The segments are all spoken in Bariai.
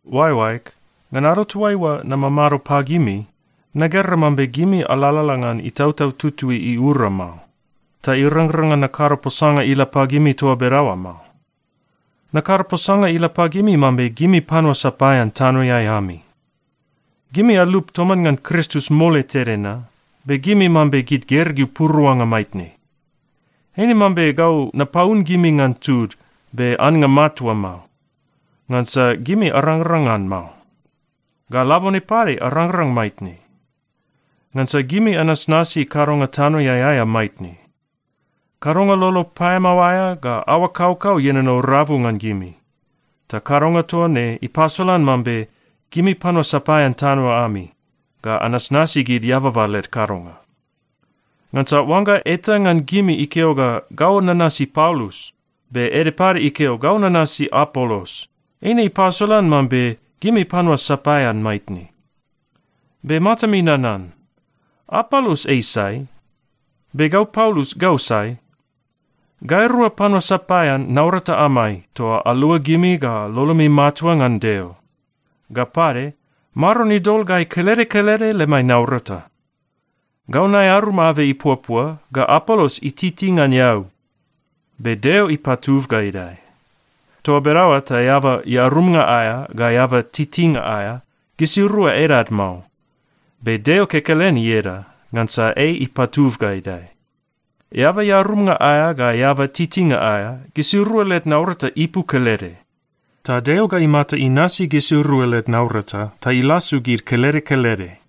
Oaeoaeg, ngan ado toaiua namamado pagimi, nagera mambe gimi alalala ngan Itautau Tutui iura mao, ta irangrang ngan nakado posanga ila pagimi toa bedaoa mao. Nakado posanga ila pagimi mambe gimi panua sapaean tanoeai ami. Gimi alup toman ngan Kristus mole tede na, be gimi mambe gid gergeu puruanga maitne. Eine mambe gau napaun gimi ngan tud, be annga matua mao, ngansa gimi arangrang ngan mao, ga labone pade arangrang maitne. Ngansa gimi anasnasi kadonga tanoeai aea maitne. Kadonga lolo paeamao aea ga aoa kaukau ienono rabu ngan gimi, ta kadonga toa ne ipasolan mambe gimi panua sapaean tano ami ga anasnasi gid eababa led kadonga. Ngansa oangga eta ngan gimi ikeo ga, “Gau nanasi Paulus,” be ede pade ikeo, “Gau nanasi Apolos,” eine ipasolan mambe gimi panua sapaean maitne. Be matami nanan. Apolos ei sai? Be gau Paulus, gau sai? Gairua panua sapaean naurata amai toa alua gimi ga lolomi matua ngan Deo. Ga pade, Maron idol gai kelede kelede lemai naurata. Gau naearum abei ipuapua, ga Apolos ititi ngan eau. Be Deo ipatub ga idae. Toa bedaoa ta eaba earumnga aea ga eaba titinga aea, gisirua edad mao. Be Deo kekelen ieda, ngansa ei ipatub ga idae. Eaba earumnga aea ga eaba titinga aea, gisirua led naurata ipu kelede. Ta Deo ga imata inasi gisirua led naurata ta ilasu gid kelede kelede.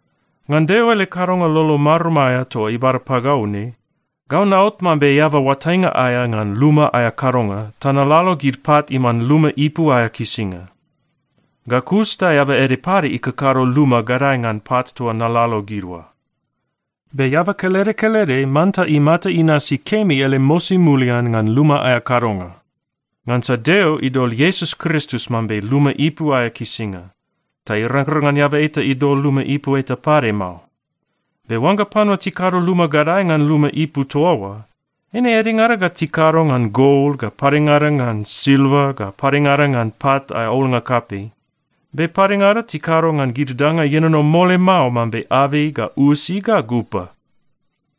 Ngan Deo ele kadonga lolo marum aea toa ibada pagau ne, gau naot mambe eaba oatainga aea ngan luma aea kadonga ta nalalo gid pat iman luma ipu aea kisinga. Ga kus ta eaba ede pade ikakado luma gadae ngan pat toa nalalo gid oa. Be eaba kelede kelede manta imata inasi kemi ele mosi mulian ngan luma aea kadonga. Ngansa Deo idol Iesus Kristus mambe luma ipu aea kisinga, ta irangrang ngan eaba eta idol luma ipu eta pade mao. Be oangga panua tikado luma gadae ngan luma ipu toa oa, eine edengada ga tikado ngan gol, ga padengada ngan silva, ga padengada ngan pat aea olnga kapei. Be padengada tikado ngan gid danga ienono mole mao mambe abei ga usi ga gupa.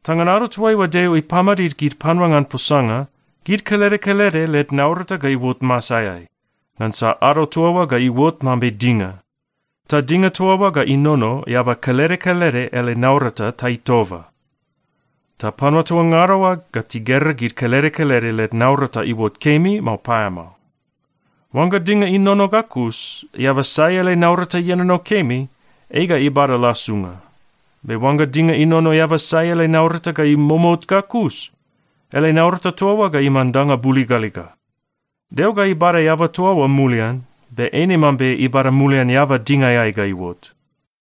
Ta ngan ado toaiua Deo ipamadid gid panua ngan posanga, gid kelede kelede led naurata ga iuot masaeai, ngansa ado toa oa ga iuot mambe dinga. Ta dinga toa oa ga inono eaba kelede kelede ele naurata ta itoba. Ta panua toa ngada oa ga tigera gid kelede kelede led naurata iuot kemi, mao paeamao. Oangga dinga inono ga kus, eaba sai ele naurata ienono kemi, ei ga ibada lasunga. Be oangga dinga inono eaba sai ele naurata ga imomout ga kus, ele naurata toa oa ga iman danga buligaliga. Deo ga ibada eaba toa oa mulian, be eine mambe ibada mulian eaba dingaeai ga iuot.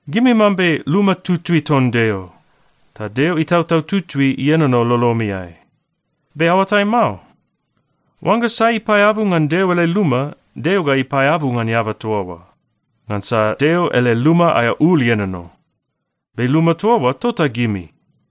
Gimi mambe luma tutui ton Deo, ta Deo Itautau Tutui ienono lolomiai, be aoatai mao? Oangga sai ipaeabu ngan Deo ele luma, Deo ga ipaeabu ngan eaba toa oa, ngansa Deo ele luma aea ul ienono. Be luma toa oa, tota gimi.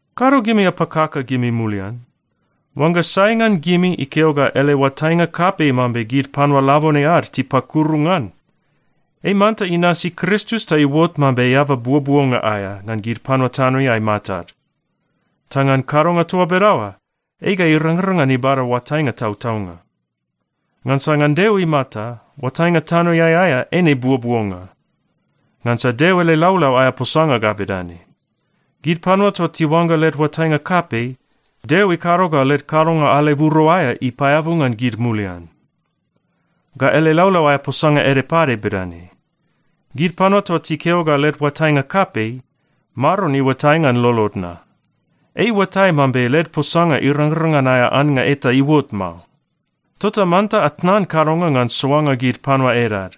Kado gimi apakaka gimi mulian. Oangga sai ngan gimi ikeo ga ele oatainga kapei mambe gid panua labone ad tipakuru ngan, ei manta inasi Kristus ta iuot mambe eaba buobuonga aea ngan gid panua tanoeai matad. Ta ngan kadonga toa bedaoa, ei ga irangrang ngan ibada oatainga tautaunga. Ngansa ngan Deo imata, oatainga tanoeai aea eine buobuonga. Ngansa Deo ele laulau aea posanga ga bedane, “Gid panua toa tiuangga led oatainga kapei, Deo ikado ga led kadonga aleburo aea ipaeabu ngan gid mulian.” Ga ele laulau aea posanga ede pade bedane, “Gid panua toa tikeo ga led oatainga kapei, Maron iuatai ngan lolod na. Ei iuatai mambe led posanga irangrang ngan aea annga eta iuot mao.” Tota manta atnan kadonga ngan soanga gid panua edad,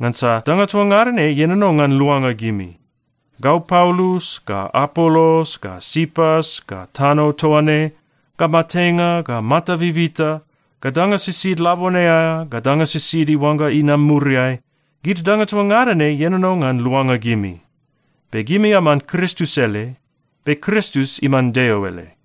ngansa danga toa ngada ne ienono ngan luanga gimi. Gau Paulus, ga Apolos, ga Sipas, ga tano toa ne, ga matenga, ga mata bibita, ga danga sisid labone aea, ga danga sisid iuangga inam muriai, gid danga toa ngada ne ienono ngan luanga gimi. Be gimi aman Kristus ele, be Kristus iman Deo ele.